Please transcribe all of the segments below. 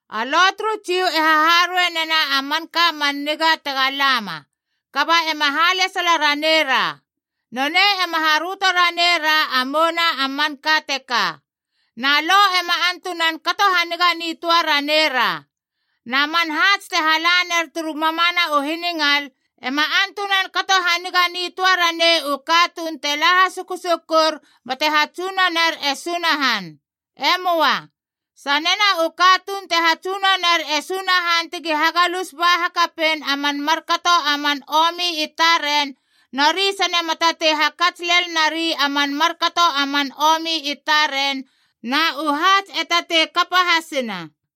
A Lo turu Jiu e haharuei nena a manka man niga tega lama, kaba ema halesala ranera. Nonei ema haröto ranei ra a mouna a manka teka. Na Lo ema antunan kato haniga nitöa ranei ra. Na man haats te hala ner turu mamana u hiningal, ema antunan kato haniga nitöa ranei u katuun te la hasukusukur bate hatsunoner e Sunahan. E möa. Sanena u katuun te hatsunoner e Sunahan ti hagalus ba hakapein a man markato a man omi i taren, nori sane ma tatei hakats lel nari a man markato a man omi i taren, na u haats e tatei kapa hasina.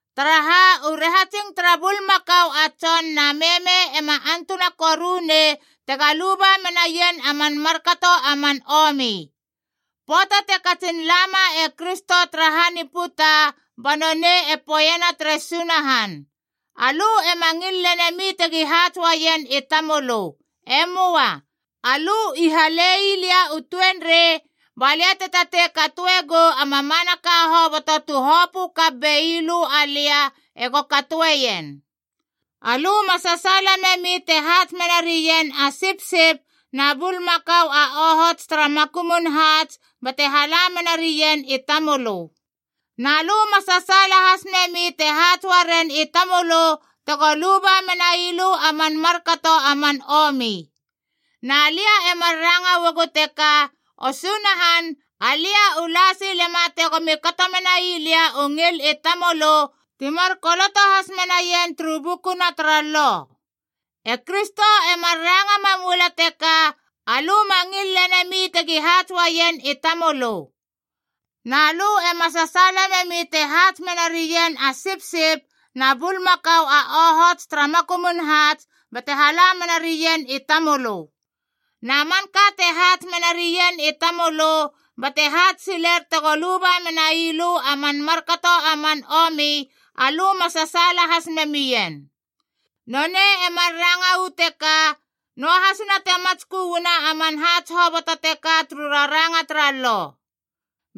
Taraha, u rahatsing tara bulmakau a tson na meme ema antuna koru nei tega luba menaien a man markato a man omi. Pöata te katsin lama e Kristo tara han i puta, ba nonei e poeiena tere Sunahan, Alö ema ngil lenemi tegi haats uaien i tamölö. E möa. Alö i hale ii lia u tuenrei, ba lia te tatei katoe gou a mamanaka hoboto tu hopö kap bei lö alia ego katoeien. Alö ma sasaala memi te haats mena rien a sipsip na bulmakau a ohots tara makumun haats bate hala mena rien i tamölö. Na lö ma sasaala has memi te haats uaren i tamölö tego luba menai lö a man markato a man omi. Na lia e mar ranga uagu teka, O Sunahan, alia i la sile ma tegomi kato menai lia u ngil i tamölö, ti mar koloto has menaien turu bukuna tara Lo. E Kristo e mar ranga mam ua lala teka, “Alö ma ngil lenemi tegi haats uaien i tamölö. Na lö ema sasaala memi te haats mena rien a sipsip na bulmakau a ohots tara makumun haats bate hala mena rien i tamölö. Na manka te haats mena rien i tamölö, bate haats siler tego luba menai lö a man markato a man omi, alö ma sasaala has memien.” Nonei e mar ranga uu teka, noahasina te matskö uana a man haats hoboto teka turu raranga tara Lo.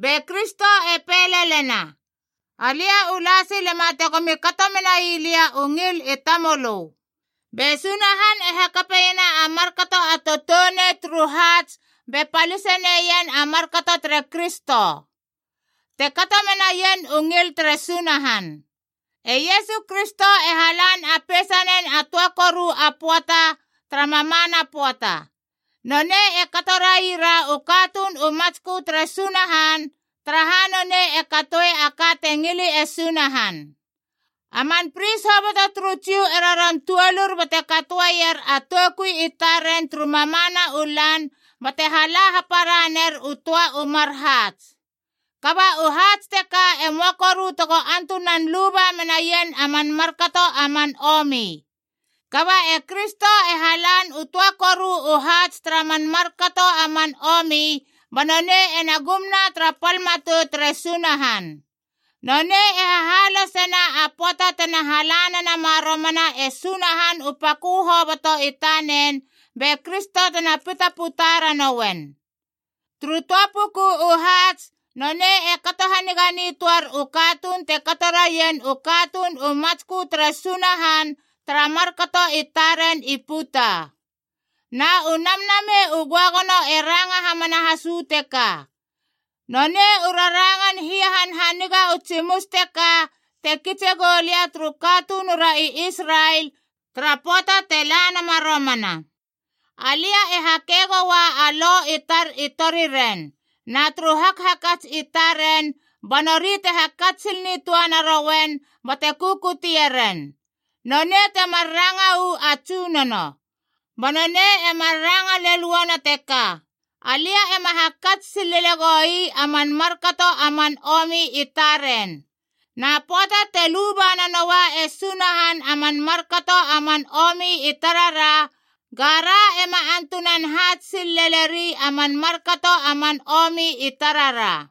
Be Kristo e pei lelena, “Alia u la silema tegomi kato menai lia u ngil i tamölö.” Be Sunahan e hakapeiena a markato a toutounei turu haats be palise neien a markato tere Kristo, te kato menaien u ngil tere Sunahan. E Iesu Kristo e halan a peisanen a töa koru a pöata tara mamana pöata.a Nonei e kato raira u katuun u matskö tere Sunahan, taraha nonei e katoi a ka te ngili e Sunahan. A man pris hoboto turu Jiu e roron tuolur bate katoeier a toukui i taren turu mamana u lan bate hala hapara ner u töa u mar haats. Kaba u haats teka e möa koru tego antunan luba menaien a man markato a man omi. Kaba e Kristo e halan u töa koru u haats tara man markato a man omi, ba nonei ena gumna tara pal matou tere Sunahan. Nonei e hahalosena a pöata tena hala nenama romana e Sunahan u pakö hoboto i tanen be Kristo tena pitaputa ranouen. Turu töa puku u haats, nonei e kato haniga nitöar u katuun te kato raien u katuun u matskö tere Sunahan tara markato i taren i puta. Na u Namnamei u Göagono e ranga hamana has uu teka: “Nonei u rarangan hia hanhaniga u tsimus teka te kitse gou lia turu katunura i Israel tara pöata te la nama romana: alia e hakei goua a lo i tar i toriren, na turu hakhakats i taren ba nori te hakats sil nitöa narouen bate kukutie ren.” Nonei temar ranga uu a Tsunono. Ba nonei e mar ranga lel uana teka, “Alia ema hakats sil lele goi a man markato a man omi i taren.” Na pöata te luba nanoua e Sunahan a man markato a man omi i tarara, gara ema antunan haats sil lele ri a man markato a man omi i tarara.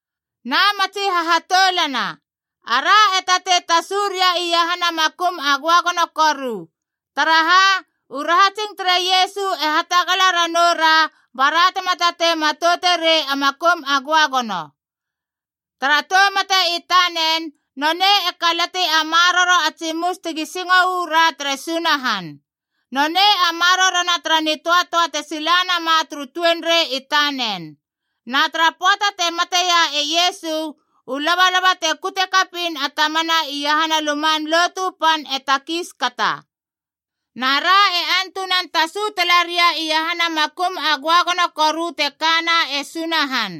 Na matsi hahatoulana, ara e tatei tasu ria iahana Makum a Göagono Koru. Taraha, u rahatsing tere Iesu e hatagala ra noura bara tema tatei matouterei a Makum a Göagono. Tara tou mate i tanen nonei e kalati a maroro a tsimus tegi singo uu ra tere Sunahan. Nonei a marorona tara nitöatöa te silanama turu tuenrei i tanen. Na tara pöata te mateia e Iesu, u labalaba te kute kapiin a tamana iahana Luman Lotu Pan e takiis kata. Na ra e antunan tasu tala ria iahana Makum a Göagono Koru te kana e Sunahan.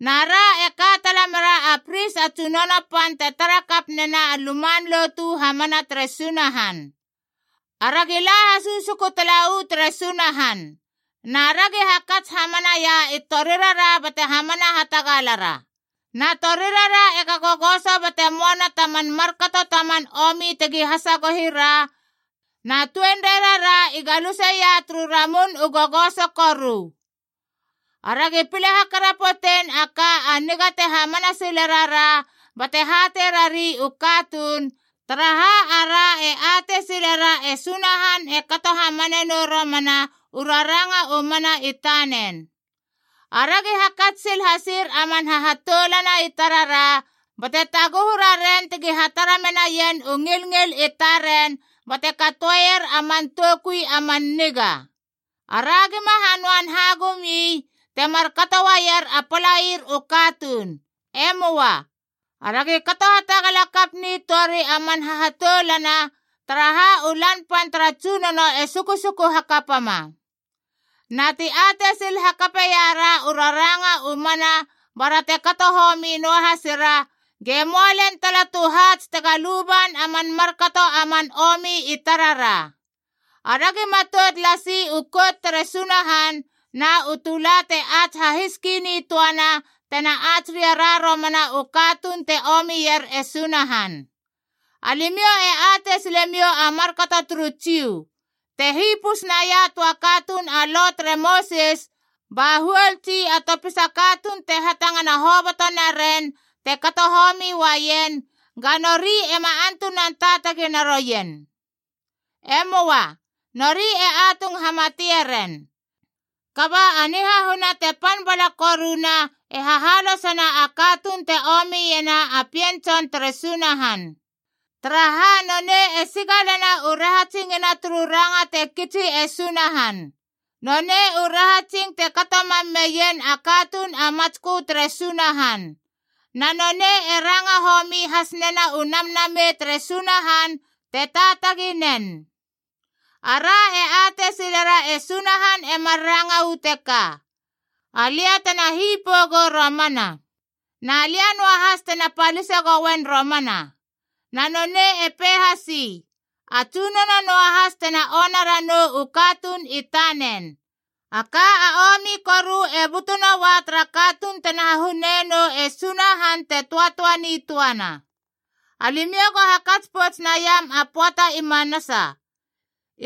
Na ra e ka tala mera a pris a tsunono pan te tara kap nena a luman lotu hamana tere Sunahan. Aragi la hasukusuku tala uu tere Sunahan. Na ragi hakats hamanaia i torirara bate hamana hatagalara. Na torirara ega gogoso bate moana ta man markato ta man omi tegi hasagohi ra, na tuenreirara i galuseia turu ramun u gogoso koru. Aragi pile hakarapotein a ka a niga te hamana sile rara bate hatei rari u katuun, taraha ara e atei silera e Sunahan e kato hamane nou romana u raranga u mana i tanen. Aragi hakats sil hasir a man hahatoulana i tarara, bate taguhu raren tegi hatara menaien u ngilngil i taren bate katoeier a man toukui a man niga. Ara gima hanöan hagum ii, te markato uaier a palair u katuun. E möa. Aragi kato hatagala kap nitöari a man hahatoulana, taraha u Lan Pan tara Tsunono e sukusuku hakapama. Na ti atei sil hakape iara u raranga u mana bara te kato homi noahasira, ge möa lel tala tu haats tega luban a man markato a man omi i tarara. Aragi matout lasi u Kout tere Sunahan na u tula te ats hahiski nitöana tena ats ria romana u katuun te omier e Sunahan. Alimiou e atei silemiou a markato turu Jiu: te hipus naia a töa katuun a Lo tere Mosis ba huol tsi a topisa katuun te hatangana hoboto naren te kato homi uaien, ga nori ema antunan taatagi naroien. E möa. Nori e atung hamatie ren. Kaba a nihahuna te pan bala koruna e hahalosena a katuun te omiena a Pien Tson tere Sunahan. Taraha, nonei e sigalena u rahatsingina turu ranga te kitsi e Sunahan. Nonei u rahatsing te kato mam meien a katuun a matskö tere Sunahan. Na nonei e ranga homi has nena u Namnamei tere Sunahan te taatagi nen. Ara e atei silera e Sunahan e mar ranga uu teka, “Alia tena hipou gou romana. Na lia noahas tena palise gouen romana.” Na nonei e pei hasi, “A Tsunono noahas tena ona ranou u katuun i tanen.” A ka a omi koru e butu noua tara katuun tena hahune nou e Sunahan te töatöa nitöana. Alimiou go hakats pouts naiam a pöata i manasa.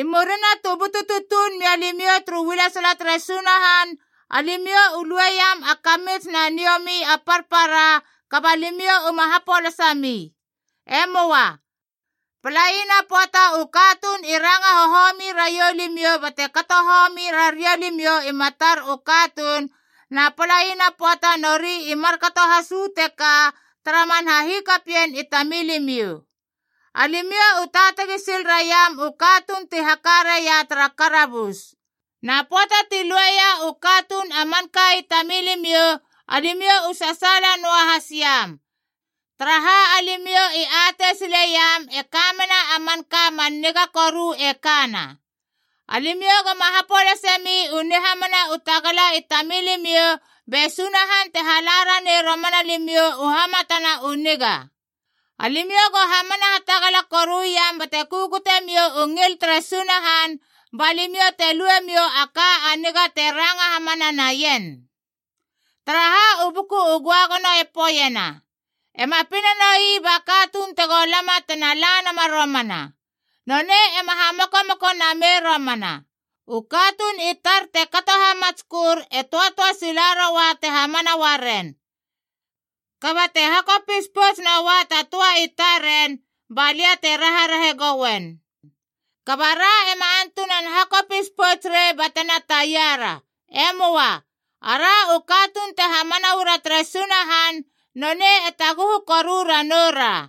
I murina tu butu tutuun mia limiou turu ualesala tere Sunahan, alimiou u lueiam a kamits na niomi a parpara, kaba limiou uma hapolasa mi. E möa. Palaina pöata u katuun i ranga hohomi raiou limiou bate kato homi raria limiou i matar u katuun, na palaina pöata nori i markato has uu teka tara man hahikapien i tamilimiou. Alimiou u taatagi sil raiam u katuun ti haka raia tara karabus. Na pöata ti lueia u katuun a manka i tamilimiou, alimiou u sasaala noahas iam, taraha alimiou i atei sileiam e ka mena a manka man niga koru e kana. Alimiou goma hapolase mi u nihamana u tagala i tamilimiou, be Sunahan te hala ranei romana limiou u hamatana u niga. Alimiou go hamana hatagala koruiam bate kukute miou u ngil tere Sunahan ba limiou te lue miou a ka a niga te ranga hamana naien. Taraha, u Buku u Göagono e poeiena: “Ema pina noi ba katuun tego lama tena la nama romana. Nonei ema hamokomoko namei romana. U katuun i tar te kato hamatskör e töatöa sila roua te hamana uaren. Kaba te hakopis pouts noua ta töa i taren, balia te raharahe gouen.” Kaba ra ema antunan hakopis pouts rei batena taiara. E möa. Ara u katuun te hamana uara tere Sunahan, nonei e taguhu koru ranou ra.